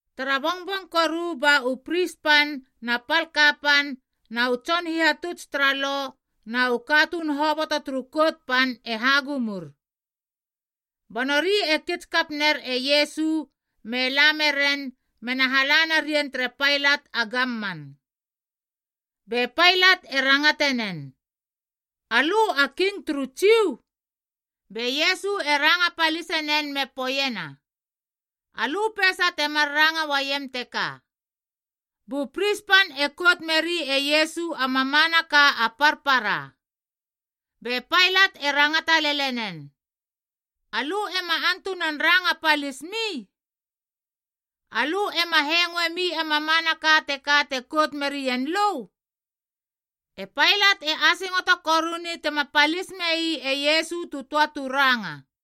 Tara bongbong koru ba u pris pan na pal kapan na u tson hihatuts tara Lo na u katuun hoboto turu Kout Pan e hagumur. Ba nori e kits kap ner e Iesu me la meren mena hala narien tere Pailat a gamman. Be Pailat e rangate nen, “Alö a king turu Jiu?” Be Iesu e ranga palise nen me poeiena, “Alö peisa temar ranga uaiem teka.” Bu pris pan e kout meri e Iesu a mamanaka a parpara. Be Pailat e rangata lele nen, “Alö ema antunan ranga palismi? Alö ema hengoemi a mamanaka teka te kout merien lö?” E Pailat e asingoto koruni tema palis mei e Iesu tu töa tu ranga.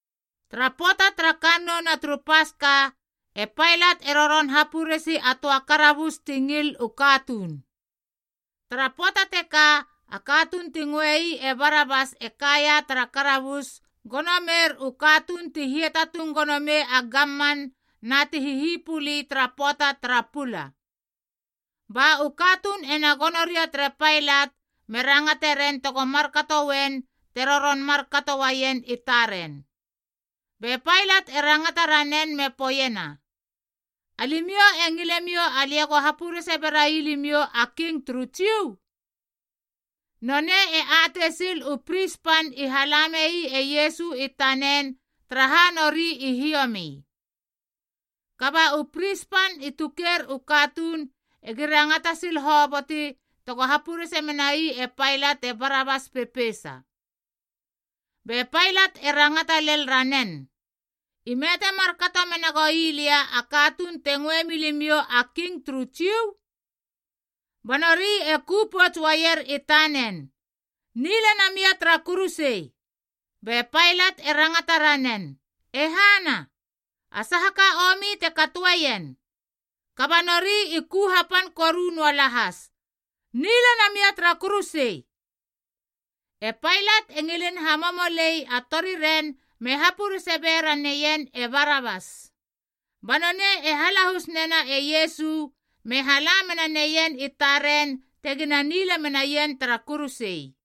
Tara pöata tara kannouna turu Paska, e Pailat e roron hapuresi a töa karabus ti ngil u katuun. Tara pöata teka a katuun ti ngöei e Barabas e kaia tara karabus gono meir u katuun ti hiatatung gono mei a gamman na ti hihipuli tara pöata tara pula. Ba u katuun ena gono ria tere Pailat me rangate ren tego markato uen te roron markato uaien i taren. Be Pailat e rangata ranen me poeiena, “Alimiou e ngilemiou alia ego hapurese berai limiou a king turu Jiu?” Nonei e atei sil u pris pan i hala mei e Iesu i tanen taraha nori i hiomi. Kaba u pris pan i tuker u katuun egi rangata sil hoboti tego hapurese menai e Pailat e Barabas pepeisa. Be Pailat e rangata lel ranen, “Ime te markato menagoi lia a katuun te ngöe milimiou a king turu Jiu?” Ba nori e ku pouts uaier i tanen “Nila namia tara kuruse!” Be Pailat e rangata ranen, “E hana? A saha ka a omi te katoeien?” Kaba nori i ku hapan koru noa lahas, “Nila namia tara kuruse!” E Pailat e ngilin hamomolei a toriren me hapurese ba bera neien e Barabas. Ba nonei e halahus nena e Iesu me hala menaneien i taren tegina nila menaien tara kuruse.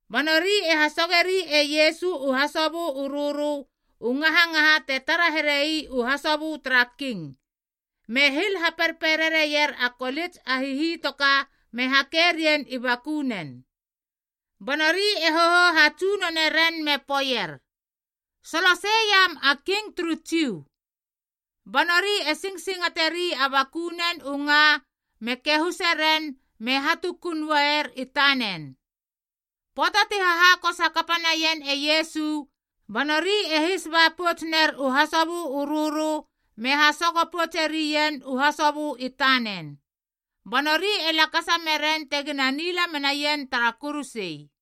Ba nori e hasogeri e Iesu u hasobö u rörö u ngahangaha te tara here ii u hasobö tara king, me hil haperperere ier a kolits a hihitoka me hake rien i bakunen. Ba nori e hohou hatsunone ren me poeier, “Solosei iam a king turu Jiu.” Ba nori e singsingateri a bakunen u nga me kahuse ren me hatukun uaier i tanen. Pöata ti hahakos hakapa naien e Iesu, ba nori e his ba pouts ner u hasobö u rörö me hasogo poutse rien u hasobö i tanen. Ba nori e lakasa meren tegina nila menaien tara kuruse.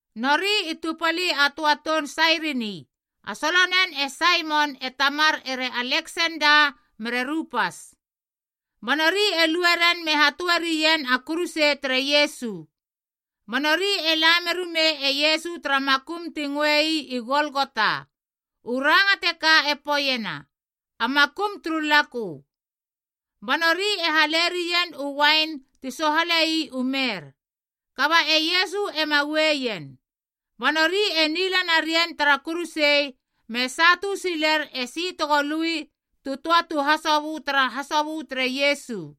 Nori i tupali a töa toun Sairini, a solonen e Saimon e tamar ere Aleksenda mere Rupas. Ba nori e lue ren me hatöerien a kuruse tere Iesu. Ba nori e la merumei e Iesu tara makum ti ngöei i Golgota (u ranga teka e poeiena “A Makum turu Lakö”). Ba nori e hale rien u uain ti sohalei u mer,a kaba e Iesu ema ueien. Ba nori e nila narien tara kuruse me satu siler esi tego lui tu töa tu hasobö tara hasobö tere Iesu.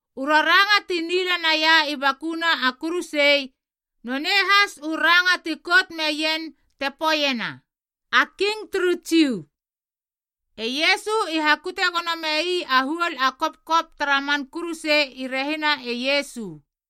U raranga ti nila nai i bakuna a kuruse, nonei has u ranga ti kout meien te poeiena: A King turu Jiu. E Iesu i hakute gono mei a huol a kopkop tara man kuruse i rehina e Iesu,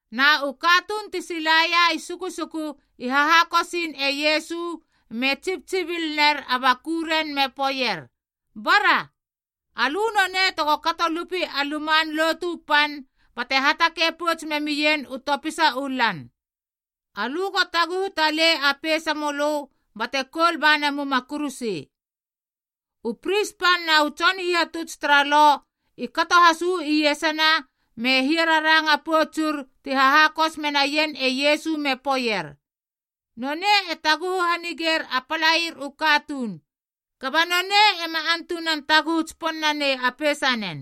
Na u katuun ti silaia i sukusuku i hahakosiin e Iesu me tsibtsibil ner a bakuren me poeier, “Bara, alö nonei tego kato lupi a Luman Lotu Pan bate hatakei pouts memien u topisa u lan. Alö go taguhu talei a peisamölö bate koul ba namuma a kuruse.” U pris pan na u tson hihatuts tara Lo i kato has uu iesana me hia raranga poutsur ti hahakos menaien e Iesu me poeier, “Nonei e taguhu hanigeir a palair u katuun, kaba nonei ema antunan taguhu tsipon nanei a peisanen.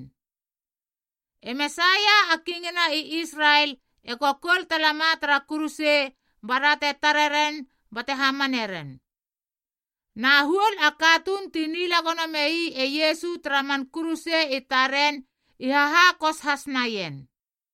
E Mesaia a Kingina i Israel ego koul talama tara kuruse bara te tare ren bate hamane ren.” Na huol a katuun ti nila gono mei e Iesu tara man kuruse i taren i hahakos has naien.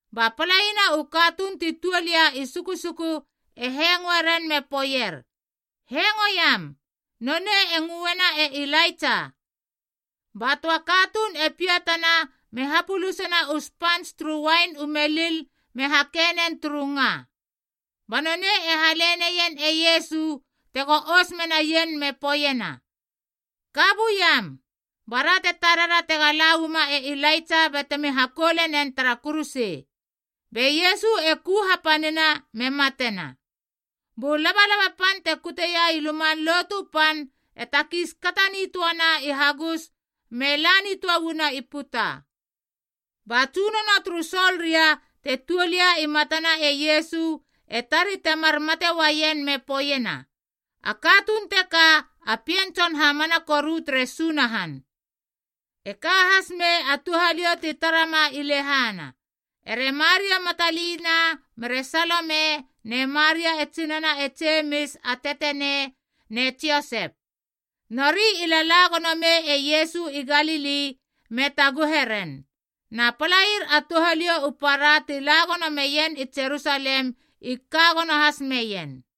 Ba palaina u katuun ti tuol ia i sukusuku e hengoe ren me poeier, “Hengoiam. Nonei e ngöeiena e Ilaitsa.” Ba töa katuun e piatana me hapölisena u spants turu uain u melil me hake nen turu nga. Ba nonei e hale neien e Iesu tego ous menaien me poeiena, “Ka buiam, bara te tarera tega la uama e Ilaitsa batemi hakoule nen tara kuruse.” Be Iesu e ku hapanina me matena. Bu labalaba pan te kuteia i Luman Lotu Pan e takiis kata nitöana i hagus me la nitöa uana i puta. Ba tsunono turu soldia te tuol ia i matana e Iesu e tari temar mate uaien me poeiena, “A katuun teka a Pien Tson hamana koru tere Sunahan.” E ka has mei a touhaliou ti tara ma i lehana, ere Maria Matalina mere Salome ne Maria e tsinana e Jemis a teteneic ne Josep. Nori i lala gono mei e Iesu i Galili me taguhe ren. Na palair a touhaliou u para ti la gono meien i Jerusalem i ka gono has meien.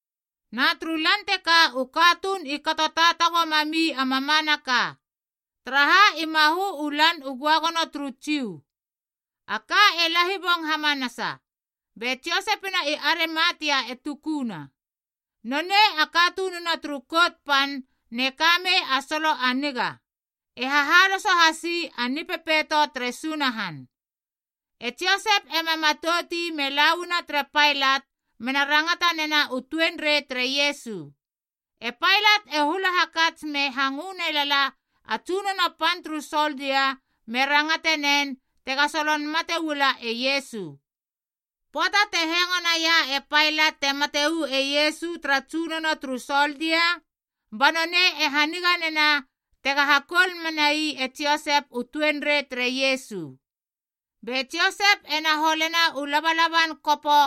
Na turu lan teka u katuun i kato taatago mami a mamanaka, taraha i mahö u Lan u Göagono turu Jiu. A ka e lahibong hamanasa, be Josepina i Arimatia e tukuna. Nonei a katununa turu Kout Pan te ka mei a solo a niga, e hahaloso hasi a Nipepeito tere Sunahan. E Josep ema matout ii me la uana tere Pailat mena rangata nena u tuenrei tere Iesu. E Pailat e hula hakats me hangö ne lala a tsunono pan turu soldia me rangatenen tega solon mate uala e Iesu. Pöata te hengo naia e Pailat te mate uu e Iesu tara tsunono turu soldia, ba nonei e hanigana tega hakoul menai e Josep u tuenrei tere Iesu. Be Josep ena holena u labalaban kopo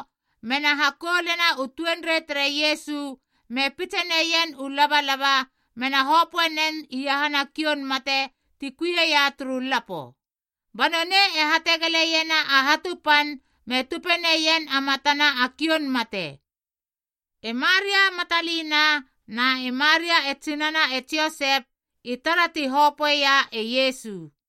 mena hakoulena u tuenrei tere Iesu me pitse neien u labalaba mena hopöe nen iahana kioun mate ti kui ia turu lapo. Ba nonei e hategeleiena a hatu pan me tupe neien a matana a kioun mate. E Maria Matalina na e Maria e tsinana e Josep i tara ti hopöeia e Iesu.